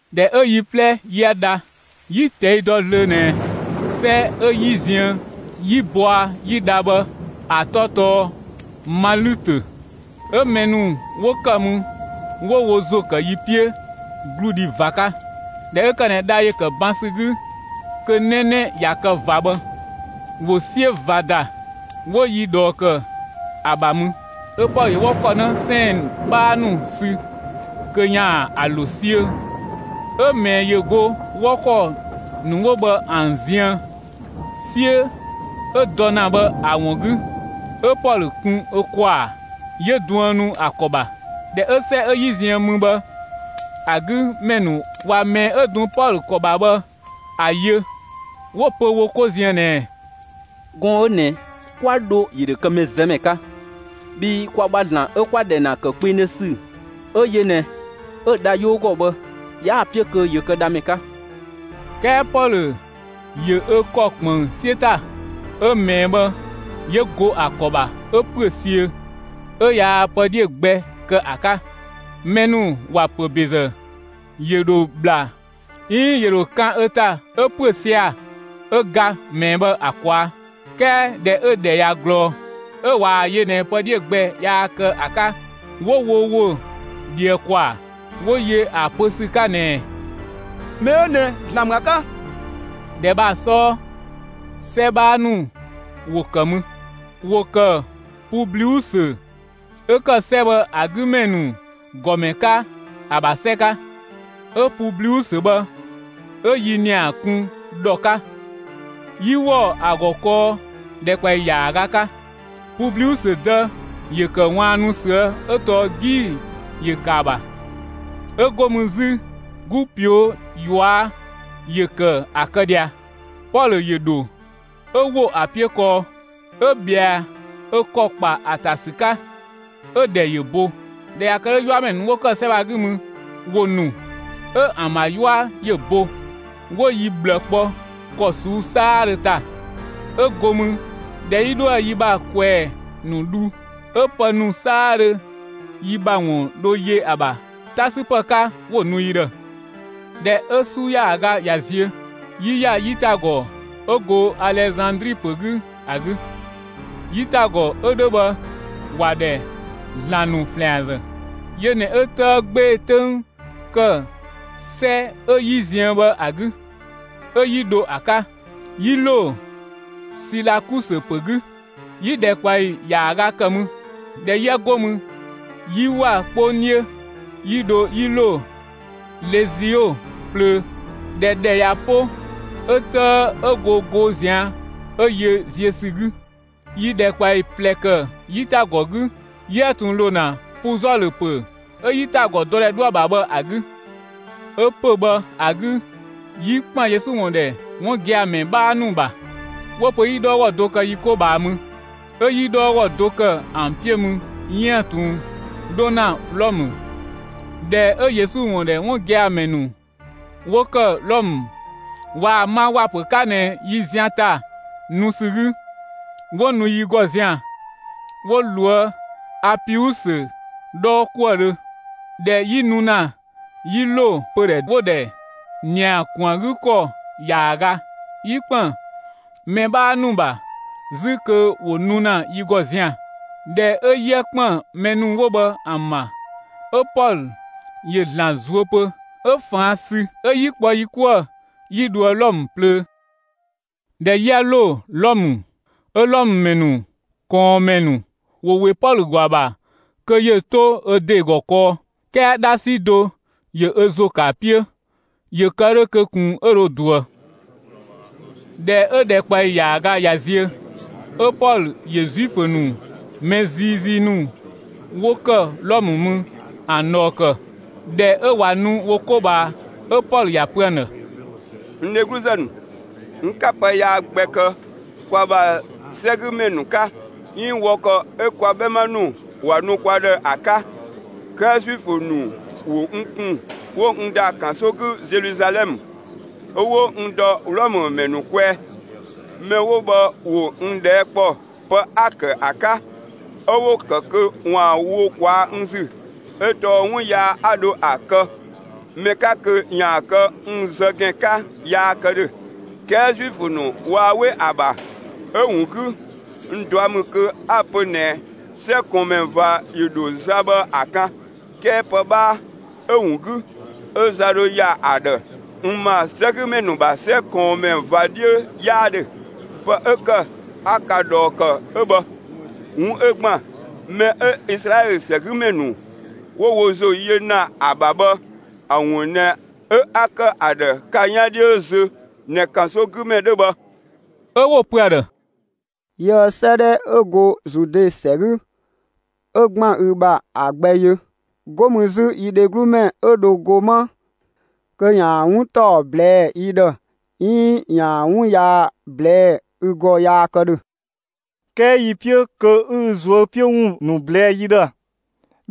꞊Dhɛ 'ö yi 'plɛ 'yië dha, 'yi‑ ꞊tɛi' dɔ zlöö ꞊nɛ 'sɛ 'ö 'yi ziën 'yi bɔa 'yi dha bhë ‑a 'tɔ tɔɔ Malütö. 'Ö mɛ ‑nu 'wo ‑kë mü 'wo wo ‑zo ‑kë yi 'piö 'gludhi ꞊va 'ka. ꞊Dhɛ 'ö ‑kë ꞊nɛ dha ‑yö ‑kë ban ‑sü 'gü kö 'nɛnɛ ꞊ya kë ꞊va bhë, ‑wo 'siö ꞊va ‑da, 'wo yi ꞊dhɔɔ ‑kë ‑a ‑bha mü. 'Ö Pɔlö ‑yö 'wɔ ‑kɔ 'në 'sɛɛn‑ 'bhaa ‑nu sü kö ‑yaan ‑a ‑lo 'siö‑. 'Ö ꞊mɛɛ ‑yö go 'wɔ ‑kɔ ‑nu 'wo bhë ‑an ziën, 'siö 'ö dɔ ‑na bhë ‑a ‑wun 'gü, 'ö Pɔlö kun ö ‑kwaa, 'yö duënu ‑a ‑kɔ ‑bha. ꞊Dhɛ 'ö 'sɛ 'ö 'yi ziën mü bhë ‑a 'gü ‑mɛ ‑nu ꞊wa ꞊mɛɛ 'ö dun Pɔlö ‑kɔ ‑bha bhë ‑a yö, 'wo‑ pö wo 'ko ziën ꞊nɛɛ: «Gɔɔn‑ 'ö ꞊nɛ 'kwa dho, ‑yö ‑dho kë mɛzëmɛ 'ka. Bhii kwa ‑bha ‑zlan 'ö 'kwa‑ ‑dhɛ ‑kë kpengdhö ‑sü 'ö yö ꞊nɛ 'ö‑ dha 'yoo ‑gɔ bhë, 'yaa‑ 'piö kö ‑yö kë dhamɛ 'ka.» 'Kɛɛ Pɔlö ‑yö ö ‑kɔ ꞊kpënng 'siö ‑ta, 'ö ꞊mɛɛ bhë ‑yö go ‑a ‑kɔ ‑bha 'ö ‑püö siö, 'ö yaa pë 'dhiö‑ gbɛ kë ‑a 'ka. Mɛ ‑nu ‑wa ‑pö ‑bezë, ‑yö ‑dho ‑bhla 'iin ‑yö ‑dho kan ‑a ‑ta 'ö ‑püö sia‑, 'ö ga ꞊mɛɛ bhë ‑a ꞊kwaa'. 'Kɛɛ ꞊dhɛ 'ö‑ ‑dhɛ ꞊ya ꞊glɔɔ, 'ö ꞊waa‑ yö ꞊nɛ pë 'dhiö‑ gbɛ yaa kë ‑a 'ka, 'wo wo ‑wo ꞊dhië ‑kwaa, 'wo yö ‑a pö ‑sü 'ka ꞊nɛɛ: «Mɛ 'ö ꞊nɛ ‑zlan ‑mü ‑a 'ka.» ‑Dhɛ bhë ‑a 'sɔɔ, 'sɛ 'bhaa ‑nu ‑wo ‑kë mü. ‑Wo ‑kë Publiusö 'ö ‑kë 'sɛ bhë ‑a 'gü ‑mɛ ‑nu ‑gɔmɛ 'ka ‑a ‑bha 'sɛ 'ka. 'Ö Publiusö bhë 'ö yi ‑nia kun ‑dhɔ 'ka, 'yi ‑wɔ ‑a ‑gɔ kɔɔ ‑dhɛkpaɔyi ‑yaaga 'ka. Publiusö dë ‑yö ‑kë ꞊waannu ꞊süë' 'ö tɔɔ 'gii‑ ‑yö ‑kë ‑a ‑bha, 'ö 'go mü 'zü, 'gu ꞊pio' ꞊yua' ‑yö ‑kë ‑a kë ꞊dhia. Pɔlö ‑yö ‑dho, 'ö ‑wo ‑a 'piö kɔɔ, 'ö ꞊bhɛa ö ‑kɔ ‑kpa ‑a ‑ta ‑sü 'ka, 'ö‑ ‑dhɛ ‑yö bo. ꞊Dhɛ ꞊ya kë 'dhö, 'yuamɛ ‑nu 'wo ‑kë 'sɛ bhë ‑a 'gü mü, ‑wo ‑nu 'ö ‑an ‑bha 'yua ‑yö bo. 'Wo yi ꞊bhlë kpɔ ‑kɔ ꞊suu'‑ 'saadhö ‑ta. 'Ö 'go mü, ꞊dhɛ 'yi 'dhoë‑ yi ‑bha ꞊kwɛɛ‑ ‑nu dhu, 'ö pë ‑nu 'saadhö yi ‑bha ‑wun dho yö ‑a ‑bha 'ta 'sü ‑pë 'ka, 'wo‑ nu yi ‑dhë. ꞊Dhɛ 'ö 'su ‑yaaga ꞊ya ziö, 'yi ‑ya 'yitagɔ 'ö go Alezandri ‑pö 'gü ‑a 'gü. 'Yitagɔ 'ö 'dhö bhë, ‑wa ‑dhɛ «‑zlan ‑nu ‑flɛanzë». Yö ꞊nɛ 'ö 'tëë 'gbee‑ 'töng ‑kë 'sɛ 'ö 'yi ziën bhë ‑a 'gü. 'Ö 'yi dho ‑a 'ka. 'Yi ‑lo Silakusö ‑pö 'gü; yi ‑dhɛkpaɔyi ‑yaaga ‑kë mü. ꞊Dhɛ 'yië 'go mü, 'yi ‑wa 'kpong 'dhiö, 'yi dho 'yi ‑lo Lezio plöö. ꞊Dhɛ ‑dhɛ ꞊ya 'po, 'ö 'tëë 'ö go goo ꞊zian' 'ö yö ziö ‑sü 'gü. 'Yi ‑dhɛkpaɔyi ꞊plɛ ‑kë 'yitagɔ 'gü 'yiëë‑ ꞊tun ‑lo ‑na Puzɔlö ‑pö 'ö 'yitagɔ ‑dɔdhɛ 'dhoë‑ ‑bha bhë ‑a 'gü. 'Ö pö‑ bhë ‑a 'gü 'yi ‑kpën Yesu ‑wun ‑dhɛ 'wun gia‑ ‑mɛ 'bhaa ‑nu ‑bha. 'Wo‑ pö 'yi 'dhɔɔgɔ do kë yi 'ko ꞊bhaa mü. 'Ö 'yi 'dhɔɔgɔ do kë ‑an 'piö mü 'yiën‑ ꞊tun 'dho ‑na Wlɔmë. ꞊Dhɛ 'ö Yesu ‑wun ‑dhɛ 'wun gia‑ ‑mɛ ‑nu 'wo ‑kë Wlɔmë, ꞊waa‑ ma ‑wa ‑pö 'ka ꞊nɛ yi zian ‑ta nu ‑sü 'gü, 'wo nu yi ‑gɔ zian‑, 'wo loë Apiusö 'dhɔɔkuëdhö. ꞊Dhɛ 'yi nu ‑na 'yi ‑lo pödhɛ 'wo‑ ‑dhɛ «‑Nia ‑kun ‑a 'gü ‑kɔ ‑yaaga», 'yi ‑kpën mɛ 'bhaa ‑nu ‑bha 'zü kö ‑wo nu ‑na yi ‑gɔ zian‑. ꞊Dhɛ 'ö 'yië ‑kpën mɛ ‑nu 'wo bhë ‑an ‑bha, 'ö Pɔlö ‑yö ‑Zlan zuö pö; 'ö ꞊faan' sü, 'ö 'yi kpɔ yi 'kuë‑ 'yi dhoë Wlɔmë plöö. ꞊Dhɛ 'yië ‑lo Wlɔmë, 'ö Wlɔmë ‑mɛ ‑nu ꞊kɔɔnmɛ ‑nu ‑wo ‑we Pɔlö ‑gɔ ‑a ‑bha kö ‑yö 'to ö ‑de ‑gɔ kɔɔ, 'kɛɛ 'dhasi do ‑yö ö ‑zo ‑kë ‑a 'piö, ‑yö kë 'dhö kö ꞊kun 'ö dho ꞊duë. ꞊Dhɛ 'ö ‑dhɛkpaɔyi ‑yaaga ꞊ya ziö, 'ö Pɔlö ‑yö Zuifö ‑nu mɛ ziizii ‑nu 'wo ‑kë Wlɔmë mü ‑an ꞊dhɔɔ ‑kë. ꞊Dhɛ 'ö ꞊wa nu wo 'ko ꞊bhaa, 'ö Pɔlö ‑ya pö ‑an ‑dhë: «N dhegluzë ‑nu, n 'ka pë yaa gbɛ kë kwa ‑bha 'sɛgümɛ ‑nu 'ka, 'iin wɔ ‑kɔ 'ö kwa 'bhɛma ‑nu ‑wa nu kwa ‑dhë ‑a 'ka. 'Kɛɛ Zuifö ‑nu ‑wo n kun 'wo n ‑da ‑kanso 'gü Zeluzalɛmë, 'ö 'wo n ‑dɔ Wlɔmë ‑mɛ ‑nu kwɛɛ. Mɛ 'wo bhë ‑wo n ꞊dhɛɛ' ‑kpɔ pë 'a‑ ‑kë ‑a 'ka, 'ö 'wo‑ ‑kë kö 'waan‑ wo ꞊kwaa'‑ n ‑zü, 'ö tɔɔ 'wun yaa 'a dho kë ‑a kë ‑mɛ 'ka kö ‑yaan kë n zë ‑gɛn 'ka yaa kë ‑dhö. 'Kɛɛ Zuifö ‑nu waa 'we ‑a ‑bha. 'Ö‑ ‑wun 'gü, n ꞊dua' ‑mü kö 'a‑ pö ꞊nɛ 'sɛ ꞊kɔɔnmɛ ꞊va 'yö dho za bhë ‑a 'kan. 'Kɛɛ pë 'bhaa 'ö‑ ‑wun 'gü 'ö za dho ‑ya ‑a ‑dhë, n ‑ma 'sɛgümɛ ‑nu ‑bha 'sɛ ꞊kɔɔnmɛ ꞊va 'dhiö 'yaa ‑dhö. Pë 'ö ‑kë 'a ka ꞊dhɔɔ ‑kë 'ö bhë. 'Wun 'ö ‑gban mɛ 'ö Izlaɛlö ‑sɛgümɛ ‑nu 'wo wo ‑zo yö ‑na ‑a ‑bha bhë ‑a ‑wun ꞊nɛ 'ö 'a‑ kë ‑a ‑dhë ka 'yaan 'dhiö zö ꞊nɛ ‑kansogümɛ 'dhö bhë.» 'Ö 'wo‑ pö ‑a ‑dhë: «Yiëë 'sëëdhɛ 'ö go Zude ‑sɛ 'gü 'ö ‑gban ü ‑bha ‑a gbɛ yö, 'go mü 'zü, yi dheglumɛ 'ö dho go 'ma kö ‑yaan 'wun ‑taɔ ꞊blɛɛ'‑ yi ‑dhë, 'iin ‑yaan 'wun yaa ꞊blɛɛ'‑ ü ‑gɔ yaa kë ‑dhö. 'Kɛɛ yi‑ 'piö kö 'ü ü ꞊zuö' 'piö ‑wun ‑nu ꞊blɛɛ' yi ‑dhë.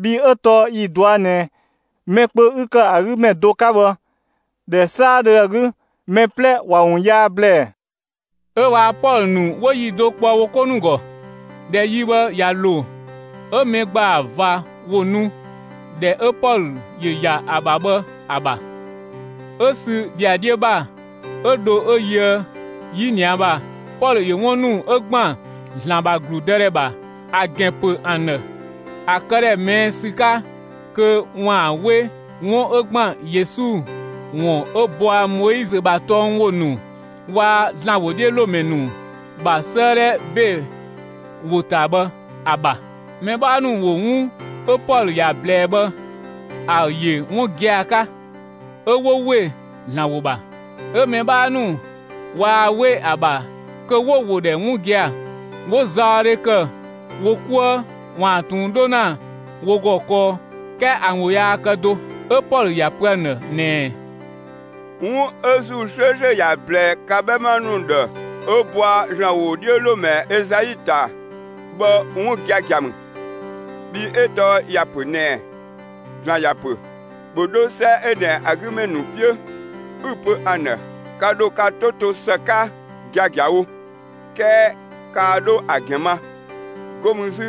Bhii 'ö tɔɔ yi‑ ꞊dɔa' ꞊nɛ mɛ kpö 'ü ‑kë ‑a 'gü ‑mɛ do 'ka bhë, ‑dhɛ 'saadhö ‑a 'gü, mɛ 'plɛ ‑wa ‑wun yaa ‑blɛɛ.» 'Ö waa‑ Pɔlö ‑nu 'wo yi do kpɔ wo 'ko ‑nu ‑gɔ. ꞊Dhɛ yi bhë ꞊ya ‑lo, 'ö mɛ ‑gbaa ꞊va ‑wo nu ‑dhɛ 'ö Pɔlö ‑yö ‑ya ‑a ‑bha bhë ‑a ‑bha. 'Ö sü ‑dhiadhiö ‑bha 'ö dho 'ö yöë 'yinia ‑bha, Pɔlö ‑yö 'wun ‑nu 'ö ‑gban ‑Zlan ‑bha ‑gludë ‑dhɛ ‑bha ‑a ‑gɛn ‑pö ‑an ‑dhë, ‑a këdhɛ ꞊mɛɛ' ‑sü 'ka kö ‑waan 'we 'wun 'ö ‑gban Yesu ‑wun 'ö bɔa Moizö ‑bha tɔng ‑wo ‑nu waa‑ ‑Zlan ‑wodhiölomɛ ‑nu ‑bha 'sëëdhɛ ‑be ‑wo ‑ta bhë ‑a ‑bha. Mɛ 'bhaa ‑nu ‑wo 'wun 'ö Pɔlö ‑ya ꞊blɛɛ bhë ‑a ‑yö 'wun gia‑ 'ka, 'ö 'wo ‑we ‑Zlan ‑wo ‑bha. 'Ö mɛ 'bhaa ‑nu waa 'we ‑a ‑bha kö 'wo‑ ‑wo ‑dhɛ 'wun gia‑. 'Wo zaɔdhe ‑kë wo 'kuë ‑waan ꞊tun 'dho ‑na wo ‑gɔ kɔɔ, 'kɛɛ ‑an ‑wo yaa kë do. 'Ö Pɔlö ‑ya pö ‑an ‑dhë ꞊nɛɛ: «'Wun 'ö ‑Zuu 'slööslö ‑ya ꞊blɛɛ ka 'bhɛma ‑nu ‑dhë 'ö bɔa ‑Zlan ‑wodhiölomɛ Ezai ‑ta bhë 'wun giagia ‑mü. Bhii 'ö tɔɔ ‑ya ‑pö ꞊nɛɛ: ‑Zlan ‑ya ‑pö: ‑Bhö 'dho 'sɛ 'ö ꞊nɛ ‑a 'gü ‑mɛ ‑nu 'piö, 'ü‑ pö ‑an ‑dhë: Ka ‑dho ka 'to to ‑së 'ka giagiawo, 'kɛɛ kaa 'dho ‑a ‑gɛn ma. 'Go mü 'zü,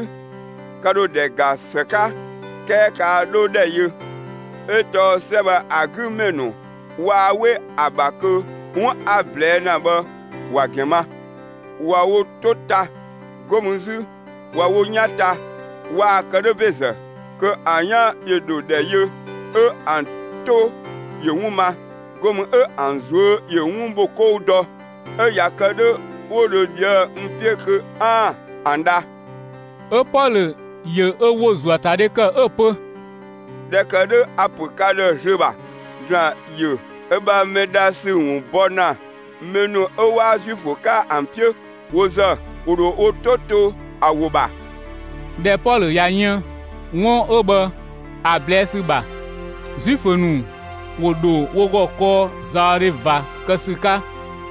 ka ‑dho ‑dhɛ ‑ga ‑së 'ka, 'kɛɛ kaa 'dho ‑dhɛ yö. 'Ö tɔɔ 'sɛ bhë ‑a 'gü ‑mɛ ‑nu waa 'we ‑a ‑bha kö 'wun 'a‑ ꞊blɛɛ' ‑na bhë ‑wa ‑gɛn ma. ꞊Wa wo 'to ta, 'go mü 'zü ꞊wa wo 'yan ta. Waa‑ ‑kë 'dhö ‑bezë, kö ‑an 'yan ‑yö ‑dho ‑dhɛ yö 'ö ‑an 'to ‑yö 'wun ma, 'go mü 'ö ‑an ꞊zuö' ‑yö 'wun ‑bho 'kɔu dɔ; 'ö ꞊ya kë 'dhö 'wo dho ꞊dhië'‑ n 'piö kö 'aan‑ ‑an dha.» 'Ö Pɔlö ‑yö ö ‑wo ‑zuöatadhe ‑kë 'ö‑ pö: «꞊Dhɛ ‑kë 'dhö a‑ ‑pö ka ‑dhë zlöö ‑bha, ‑Zlan ‑yö ö ‑bha mɛ dha ‑sü ‑wun bɔ ‑na mɛ ‑nu 'ö 'waa Zuifö 'ka ‑an 'piö. Wo ‑zë, ‑wo ‑dho wo 'to to ‑a ‑wo ‑bha.» [꞊Dhɛ Pɔlö ꞊ya yën 'wun 'ö bhë ‑a ꞊blɛɛ' ‑sü ‑bha, Zuifö ‑nu ‑wo ‑dho wo ‑gɔ kɔɔ zaɔdhe ꞊va kë ‑sü 'ka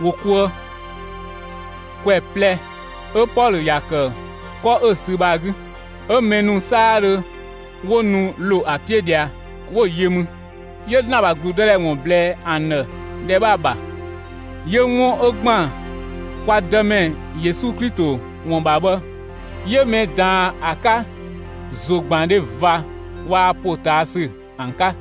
wo 'kuë.] ‑Kwɛ ꞊plɛ 'ö Pɔlö ‑ya ‑kë 'kɔ 'ö‑ sü bhë ‑a 'gü. 'Ö mɛ ‑nu 'saadhö 'wo nu ‑lo ‑a 'piö ꞊dhia 'wo‑ yö mü. 'Yö ‑Zlan ‑bha ‑gludëdhɛ ‑wun ‑blɛɛ ‑an ‑dhë ‑dhɛ bhë ‑a ‑bha, 'yö 'wun 'ö ‑gban kwa Dëmɛ Yesu Klito ‑wun ‑bha bhë, 'yö mɛ ꞊daan ‑a 'ka ‑zogbandhe ꞊va waa‑ ‑potaasü ‑an 'ka.